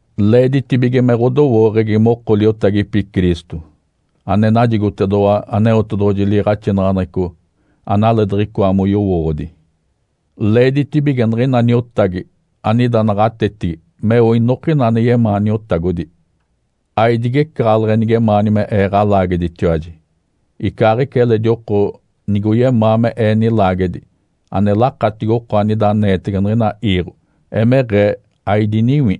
Leeditibige me ɡ̶odowooɡ̶egi moko liotagipi Cristo, ane najigotedoɡ̶owa Aneotedoɡ̶oji liiɡ̶axinaɡ̶aneɡ̶eco analee diɡ̶icoa moyowooɡ̶odi. Leeditibige niɡ̶ina niotagi anida naɡ̶atetigi meo inokina ane yemaa niotagodi. Aidigecaɡ̶aleɡ̶e nigemaani me ee ɡ̶alaageditiwaji, icaaɡ̶ica eledi oko nigoyemaa me ee nilaagedi ane lakatigi oko anida aneetege niɡ̶ina iiɡ̶o. Emeɡ̶ee aidiniwi.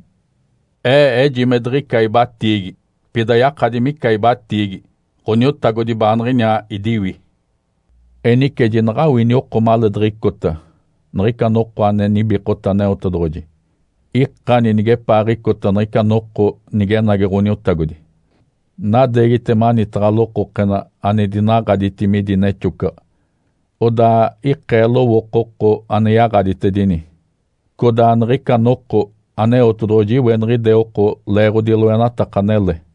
Ee eji me diɡ̶ica ibatiigi. Pida yakadi mica ibatiigi, Ǥoniotagodi baaniɡ̶iniaa idiwi. Enice jinaɡ̶awini oko maleediɡ̶icota niɡ̶ica noko ane nibikota Aneotedoɡ̶oji! Ikani nigepaaɡ̶icota niɡ̶ica noko nigenagi Ǥoniotagodi! Nadeegite manitaɡ̶a lokokena ane dinaɡ̶aditi midi nexocaɡ̶a, odaa ikee lowooko oko ane yaɡ̶aditedini. Codaa niɡ̶ica noko Aneotedoɡ̶oji iweniɡ̶ide oko leeɡ̶odi loenataka anele.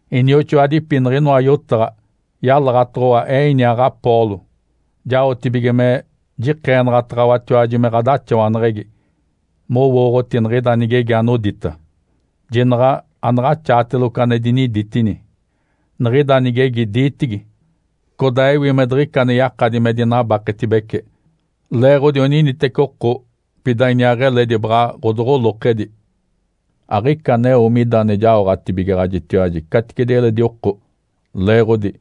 Inioxoadipi, niɡ̶inoa yotaɡ̶a oyalaɡ̶atoɡ̶owa ee iniaa Apolo jaotibige me jikeenaɡ̶ataɡ̶awatiwaji me ɡ̶adaxawaneɡ̶egi mowooɡ̶oti niɡ̶ida nigegi anodita, “Jinaɡ̶a anaɡ̶axaateloco ane diniditini!” Niɡ̶ida nigegi diitigi, codaa ewi me diɡ̶ica ane yakadi me dinabaketibece leeɡ̶odi oniniteci oko, pida iniaa eledi baɡ̶a ɡ̶adoɡ̶olokedi. Aɡ̶ica aneo mida ane jaoɡ̶atibigaɡ̶ajitiwaji caticedi eledi oko. Leeɡ̶odi,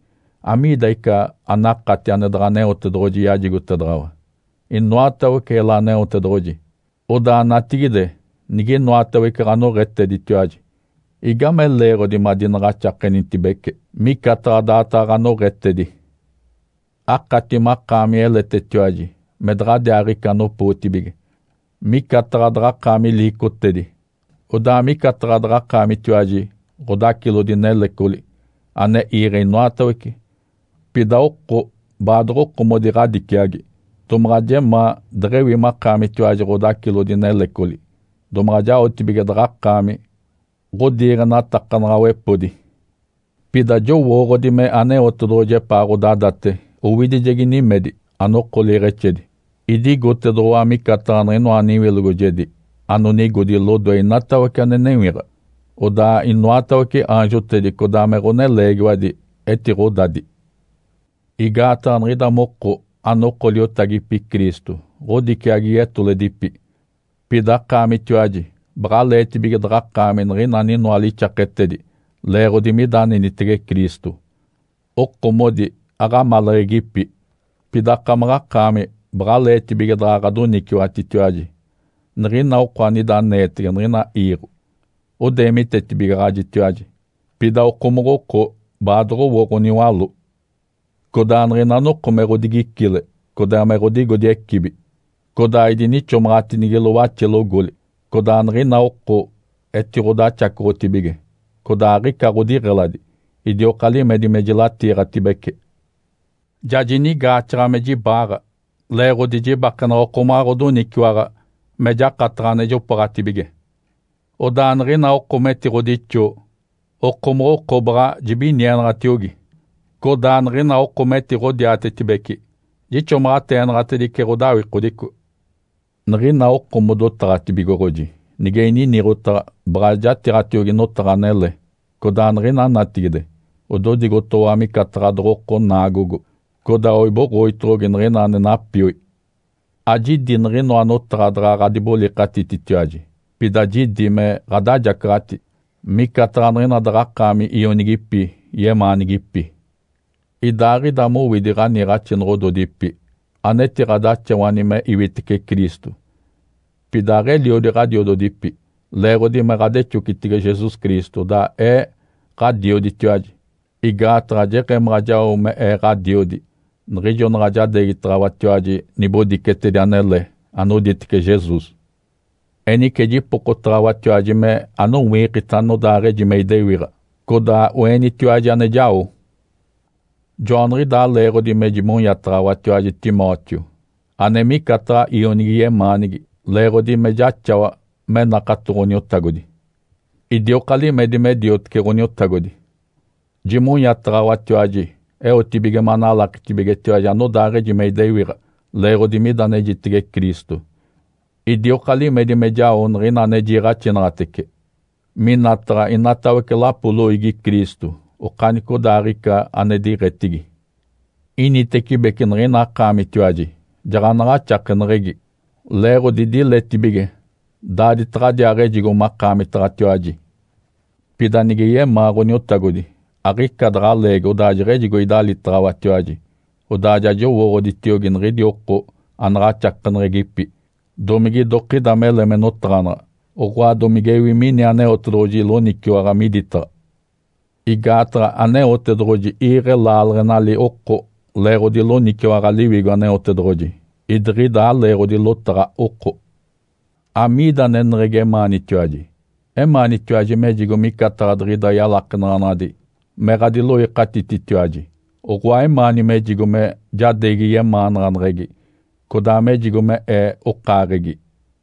amiidi ica anakati ane daɡ̶a Aneotedoɡ̶oji yajigotedaɡ̶awa? Inoatawece ela Aneotedoɡ̶oji. Odaa natigide niginoatawece ɡ̶anoɡ̶eteditiwaji, igame leeɡ̶odi madinaɡ̶axakenitibece micataɡ̶a daataɡ̶a ɡ̶anoɡ̶etedi? Akati makaami eletetiwaji, me daɡ̶adiaaɡ̶ica anopootibige, micataɡ̶a daɡ̶akaami liicotedi, odaa micataɡ̶a daɡ̶akaamitiwaji ɡ̶odacilodi nelecoli ane iiɡ̶e inoatawece, pida oko baadoɡ̶okomodi ɡ̶adiciagi. Domaɡ̶a jemaa deɡ̶ewi makaamitiwaji ɡ̶odacilodi nelecoli domaɡ̶a jaoɡ̶atibige daɡ̶akaami ɡ̶odiiɡ̶enatakanaɡ̶awepodi. Pida jowooɡ̶odi me Aneotedoɡ̶oji epaa ɡ̶odadate owidijegi nimedi, anoko liiɡ̶exedi. Idigotedoɡ̶owa micataɡ̶a niɡ̶inoa niwilogojedi anonigodi lodoe inatawece ane newiɡ̶a, odaa inoatawece aanjotedi codaa me ɡ̶oneleegiwadi etiɡ̶odadi. Igaataɡ̶a niɡ̶ida moko anoko liotagipi Cristo ɡ̶odiciagi yetoledipi, pida akaamitiwaji baɡ̶aleetibige daɡ̶akaami niɡ̶ina aninoa lixaketedi leeɡ̶odi mida anenitege Cristo. Okomodi aɡ̶amaleɡ̶egipi, pida akamaɡ̶akaami baɡ̶aleetibige daɡ̶a ɡ̶adoniciwatitiwaji. Niɡ̶ina oko anida aneetege niɡ̶ina iiɡ̶o odeemitetibigaɡ̶ajitiwaji, pida okomoɡ̶oko baadoɡ̶owo ɡ̶oniwaló. Codaa niɡ̶ina noko me ɡ̶odigicile codaa me ɡ̶odigodi ecibi, codaa idinixomaɡ̶atinigilo waxelogoli. Codaa niɡ̶ina oko etiɡ̶odaxacoɡ̶otibige, codaa aɡ̶ica ɡ̶odiɡ̶eladi, idioka limedi me jilatiiɡ̶atibece. Ja jinigaaxaɡ̶a me jibaaɡ̶a leeɡ̶odi jibakenaɡ̶a okomaɡ̶a ɡ̶odoniciwaɡ̶a me jakataɡ̶a ane jopooɡ̶atibige. Odaa niɡ̶ina oko metiɡ̶odixoo, okomoɡ̶oko baɡ̶a jibinienaɡ̶atiogi. Codaa niɡ̶ina oko metiɡ̶odiatetibeci, jixomaɡ̶ateenaɡ̶atedice ɡ̶odawikodico. Niɡ̶ina oko modotaɡ̶atibigoɡ̶oji, nige ininiɡ̶otaɡ̶a baɡ̶a jatiiɡ̶atiogi notaɡ̶a anele. Codaa niɡ̶ina natigide ododigotoɡ̶owa micataɡ̶a doɡ̶oko naagogo, codaa oiboɡ̶oditoɡ̶ogi niɡ̶ina ane napioi. Ajidi niɡ̶inoa notaɡ̶a daɡ̶a ɡ̶adibolikatititiwaji, pida jidi me ɡ̶adajacaɡ̶ati, micataɡ̶a niɡ̶ina daɡ̶akaami ionigipi yemaanigipi. Idaaɡ̶ida mowidi ɡ̶aniiɡ̶axinoɡ̶ododipi anetiɡ̶adaxawani me iwitece Cristo, pida aɡ̶eliodi ɡ̶adiododipi. Leeɡ̶odi me ɡ̶adexocitege Jesus Cristo, odaa ee ɡ̶adioditiwaji, igaataɡ̶a jeɡ̶emaɡ̶a jao me ee ɡ̶adiodi niɡ̶ijo naɡ̶a jadeegitaɡ̶awatiwaji nibodicetedi anele anoditece Jesus. Enice jipokotaɡ̶awatiwaji me anowiikita anodaaɡ̶eji me idewiɡ̶a, codaa oenitiwaji ane jao. Joaniɡ̶idaa leeɡ̶odi me jimonyataɡ̶awatiwaji Timóteo ane micataɡ̶a ionigi yemaanigi leeɡ̶odi me jaxawa me nakato Ǥoniotagodi. Idioka limedi me diotece Ǥoniotagodi. Jimonyataɡ̶awatiwaji eotibige manalakitibigetiwaji anodaaɡ̶eji me idewiɡ̶a leeɡ̶odi mida anejitege Cristo. Idioka limedi me jao niɡ̶ina ane jiiɡ̶axinaɡ̶atece minataɡ̶a inatawece lapo loiigi Cristo okanicodaaɡ̶ica ane diɡ̶etigi. Initecibece niɡ̶ina akaamitiwaji jaɡ̶anaɡ̶axakeneɡ̶egi, leeɡ̶odi diletibige daaditaɡ̶adiaaɡ̶ejigo makaamitaɡ̶atiwaji. Pida, nige yemaa Ǥoniotagodi, aɡ̶ica daɡ̶a leegi odaa jeɡ̶ejigo idalitaɡ̶awatiwaji, odaa ja jowooɡ̶oditiogi niɡ̶idi oko anaɡ̶axakeneɡ̶egipi, domige idokida mele me notaɡ̶anaɡ̶a, oɡ̶oa domigewi mini Aneotedoɡ̶oji loniciwaɡ̶a miditaɡ̶a. Igaataɡ̶a Aneotedoɡ̶oji iiɡ̶e laaleɡ̶enali oko leeɡ̶odi loniciwaɡ̶a Liwigo Aneotedoɡ̶oji, idiɡ̶ida aleeɡ̶odi lotaɡ̶a oko. Amiida aneneɡ̶egi emaanitiwaji? Emaanitiwaji mejigo micataɡ̶a diɡ̶ida yalakenaɡ̶anaɡ̶adi me ɡ̶adiloikatititiwaji, oɡ̶oa emaani mejigo me jadeegi yemaanaɡ̶aneɡ̶egi codaa mejigo me ee okaaɡ̶egi.